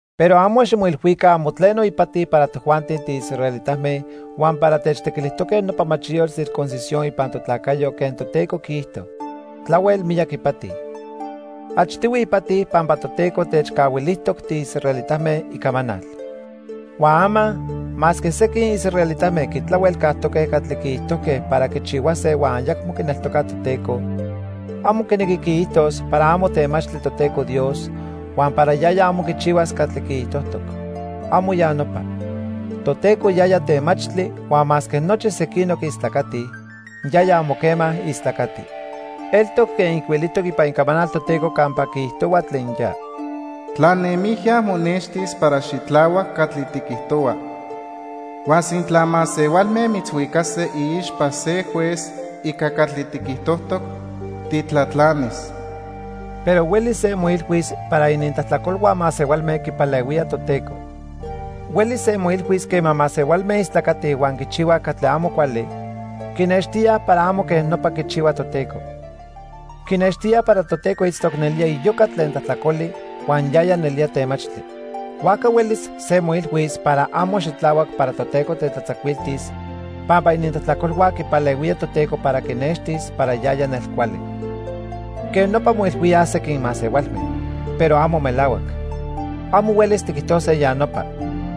Pero amo ximoilhuica amo tleno ipati para tojuanti tiisraelitame huan para techtequilijtoque nopa machiyotl circuncisión ipan totlacayo quen Toteco quiijto. Tlahuel miyac ipati. Achtihui ipati pampa Toteco techcahuilijtoc tiisraelitame Icamanal. Huan ama, masque sequin israelitame quitlahuelcajtoque catli quiijtojque para quichihuase huan ayacmo quineltocaj Toteco, amo quinequi quiijtos para amo temachtli Toteco Dios huan para yaya amo quichihuas catli quiijtojtoc. ¡Amo ya nopa! Toteco yaya temachtli huan masque nochi sequinoc istlacatij, yaya amo quema istlacati. Eltoc quen ijcuilijtoc ipan Icamanal Toteco campa quiijtohua tlen ya: "Tlanemijya monextis para xitlahuac catli tiquijtohua. Huan sintla masehualme mitzhuicase iixpa se juez ica catli tiquijtojtoc, titlatlanis." Pero huelis se moilhuis para inintlajtlacolhua masehualme quipalehuía Toteco. Huelis se moilhuis quema masehualme istlacatij huan quichihuaj catli amo cuali, quinextíaj para amo quej nopa quichihua Toteco. Quinextíaj para Toteco itztoc nelía iyoca tlen tlajtlacoli huan yaya nelía temachtli. Huajca huelis se moilhuis para amo xitlahuac para Toteco tetlatzacuiltis pampa inintlajtlacolhua quipalehuía Toteco para quinextis para yaya nelcuali. Quej nopa moilhuíaj sequin masehualme, pero amo melahuac. Amo huelis tiquijtose ya nopa.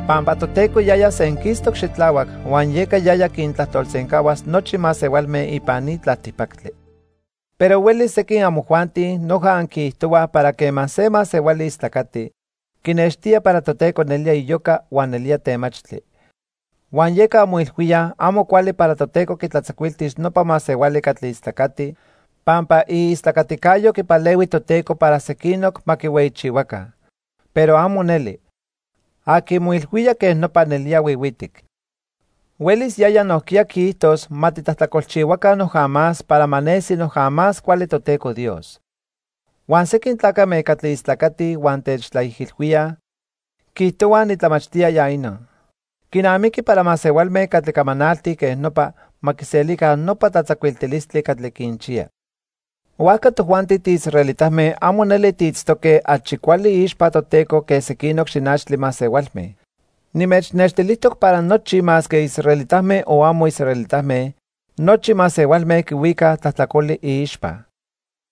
Pampa Toteco yaya senquistoc xitlahuac huan yeca yaya quintlajtolsencahuas nochi masehualme ipan ni tlaltipactli. Pero huelis sequin amojuanti noja anquiijtohuaj para quema se masehuali istlacati, quinextía para Toteco nelía iyoca huan nelía temachtli. Huan yeca anmoilhuíaj amo cuali para Toteco quitlatzacuiltis nopa masehuali catli istlacati pampa iistlacaticayo quipalehui Toteco para sequinoc ma quihueyichihuaca. Pero amo neli. Aqui moilhuía quej nopa nelía huihuitic. Huelis yaya nojquiya quiijtos ma titlajtlacolchihuaca noja más para ma nesi noja más cuali Toteco Dios. Huan sequin tlacame catli istlacatij huan techtlaijilhuíaj, quiijtohuaj nitlamachtía ya inon. Quinamiqui para masehualme catli camanaltij quej nopa ma quiselica nopa tlatzacuiltilistli catli quinchiya. Huajca tojuanti tiisraelitame amo neli tiitztoque achi cuali iixpa Toteco que sequinoc xinachtli masehualme. Nimechnextilijtoc para nochi masque israelitame o amo israelitame, nochi masehualme quihuicaj tlajtlacoli iixpa.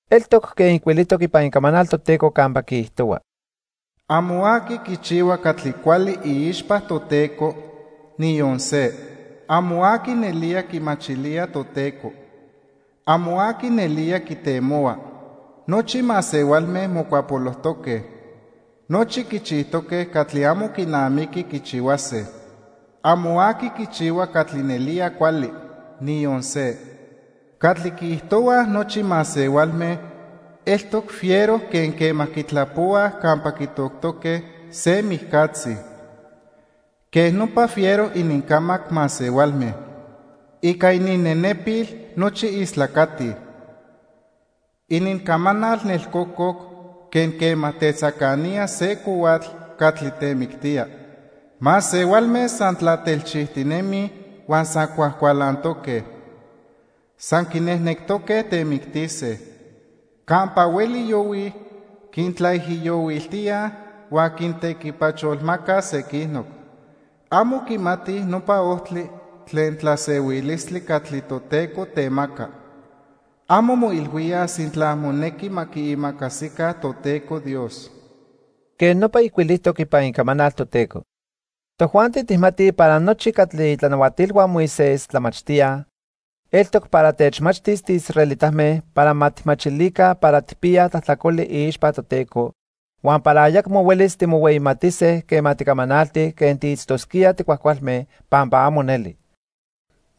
Eltoc quen ijcuilijtoc ipan Icamanal Toteco campa quiijtohua: "Amo aqui quichihua catli cuali iixpa Toteco, niyon se. Amo aqui nelía quimachilía Toteco. Amo aqui nelía quitemohua. Nochi masehualme mocuapolojtoque. Nochi quichijtoque catli amo quinamiqui quichihuase. Amo aqui quichihua catli nelía cuali. Niyon se. Catli quiijtohuaj nochi masehualme eltoc fiero quen quema quitlapohuaj campa quitoctoque se mijcatzi. Quej nopa fiero inincamac masehualme. Ica ininnenepil nochi istlacatij. Inincamanal nelcococ quen quema tetzacanía se cohuatl catli temictía. Masehualme san tlatelchijtinemij huan san cuajcualantoque. San quinejnectoque temictise. Campa hueli yohuij, quintlaijiyohuiltíaj huan quintequipacholmacaj sequinoc. Amo quimatij nopa ojtli tlen tlasehuilistli catli Toteco temaca. Amo moilhuíaj sintla monequi ma quiimacasica Toteco Dios." Quej nopa ijcuilijtoc ipan Icamanal Toteco. Tojuanti tijmatij para nochi catli itlanahuatilhua Moisés tlamachtíaj, eltoc para techmachtis tiisraelitame para ma tijmachilica para tijpiyaj tlajtlacoli iixpa Toteco, huan para ayacmo huelis timohueyimatise quema ticamanaltij quen tiitztosquíaj ticuajcualme, pampa amo neli.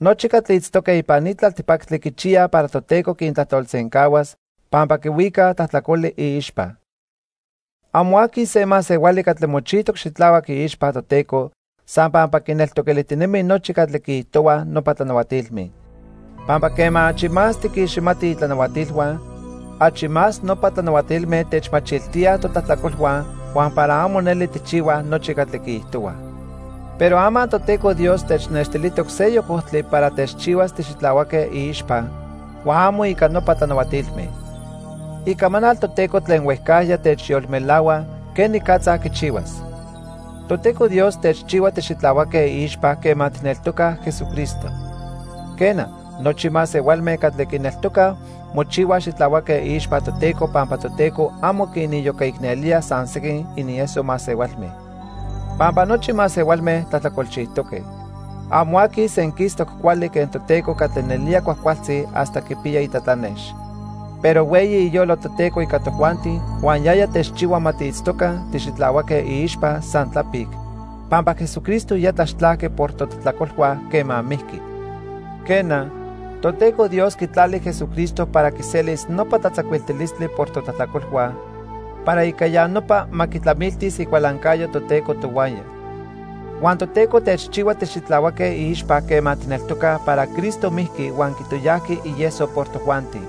Nochi catli itztoque ipan ni tlaltipactli quichiyaj para Toteco quintlajtolsencahuas pampa quihuicaj tlajtlacoli iixpa. Amo aqui se masehuali catli mochijtoc xitlahuac iixpa Toteco san pampa quineltoquilijtinemi nochi catli quiijtohuaj nopa tlanahuatilme. Pampa quema achi más tiquiximatij itlanahuatilhua, achi más nopa tlanahuatilme techmachiltíaj totlajtlacolhua huan para amo neli tijchihuaj nochi catli quiijtohuaj. Pero ama Toteco Dios technextilijtoc seyoc ojtli para techchihuas tixitlahuaque iixpa huan amo ica nopa tlanahuatilme. Icamanal Toteco tlen huejcajya techyolmelahua quenicatza quichihuas. Toteco Dios techchihua tixitlahuaque iixpa quema tijneltocaj Jesucristo. Quena, nochi masehualme catli quineltocaj mochihuaj xitlahuaque iixpa Toteco pampa Toteco amo quiniyocaicnelía san sequin inieso masehualme. Pampa nochi masehualme tlajtlacolchijtoque. Amo aqui senquistoc cuali quen Toteco catli nelía cuajcualtzi hasta quipiya itlatlanex. Pero hueyi iyolo Toteco ica tojuanti huan yaya techchihua ma tiitztoca tixitlahuaque iixpa san tlapic, pampa Jesucristo ya tlaxtlajqui por totlajtlacolhua quema mijqui. Quena, Toteco Dios quitlali Jesucristo para quiselis nopa tlatzacuiltilistli por totlajtlacolhua, para ica ya nopa ma quitlamiltis icualancayo Toteco tohuaya. Huan Toteco techchihua tixitlahuaque iixpa quema tijneltocaj para Cristo mijqui huan quitoyajqui ieso por tojuanti.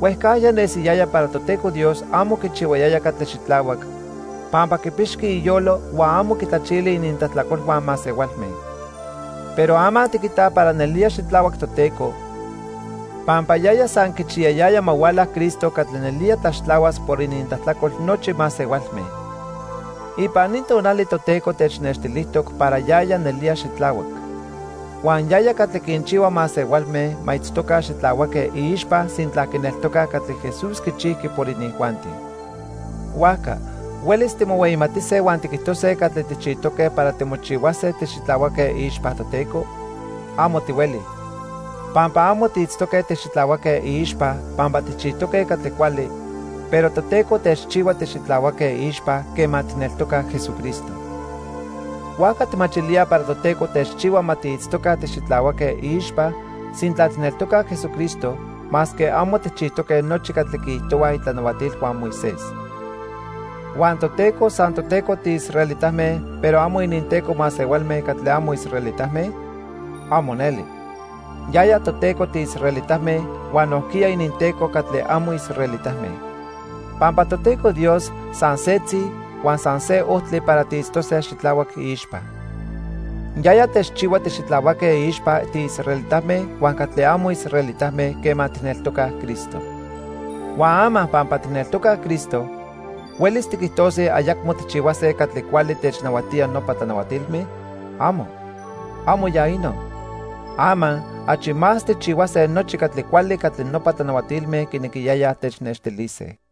Huejcajya nesiyaya para Toteco Dios amo quichihuayaya catli xitlahuac pampa quipixqui iyolo huan amo quitlachili inintlajtlacolhua masehualme. Pero ama tiquitaj para nelía xitlahuac Toteco, pampa yaya san quichiyayaya ma huala Cristo catli nelía tlaxtlahuas por inintlajtlacol nochi masehualme. Ipan ni tonali Toteco technextilijtoc para yaya nelía xitlahuac. Huan yaya catli quinchihua masehualme ma itztoca xitlahuaque iixpa sintla quineltocaj catli Jesús quichijqui por inijuanti. Huajca ¿huelis timohueyimatise huan tiquijtose catli tijchijtoque para timochihuase tixitlahuaque iixpa Toteco? Amo tihueli. Pampa amo tiitztoque tixitlahuaque iixpa pampa tijchijtoque catli cuali, pero Toteco techchihua tixitlahuaque iixpa quema tijneltocaj Jesucristo. Huajca tijmachilíaj para Toteco techchihua ma tiitztoca tixitlahuaque iixpa sintla tijneltocaj Jesucristo, masque amo tijchijtoque nochi catli quiijtohuaj itlanahuatilhua Moisés. ¿Huan Toteco san toTeco tiisraelitame pero amo ininTeco masehualme catli amo israelitame? ¡Amo neli! Yaya Toteco tiisraelitame huan nojquiya ininTeco catli amo israelitame. Pampa Toteco Dios san setzi huan san se ojtli para tiitztose xitlahuac iixpa. Yaya techchihua tixitlahuaque iixpa tiisraelitame huan catli amo israelitame quema tijneltocaj Cristo. Huan ama pampa tijneltocaj Cristo, ¿huelis tiquijtose ayacmo tijchihuase catli cuali technahuatía nopa tlanahuatilme? ¡Amo! ¡Amo ya inon! Ama, achi más tijchihuase nochi catli cuali catli nopa tlanahuatilme quinequiyayaj technextilise.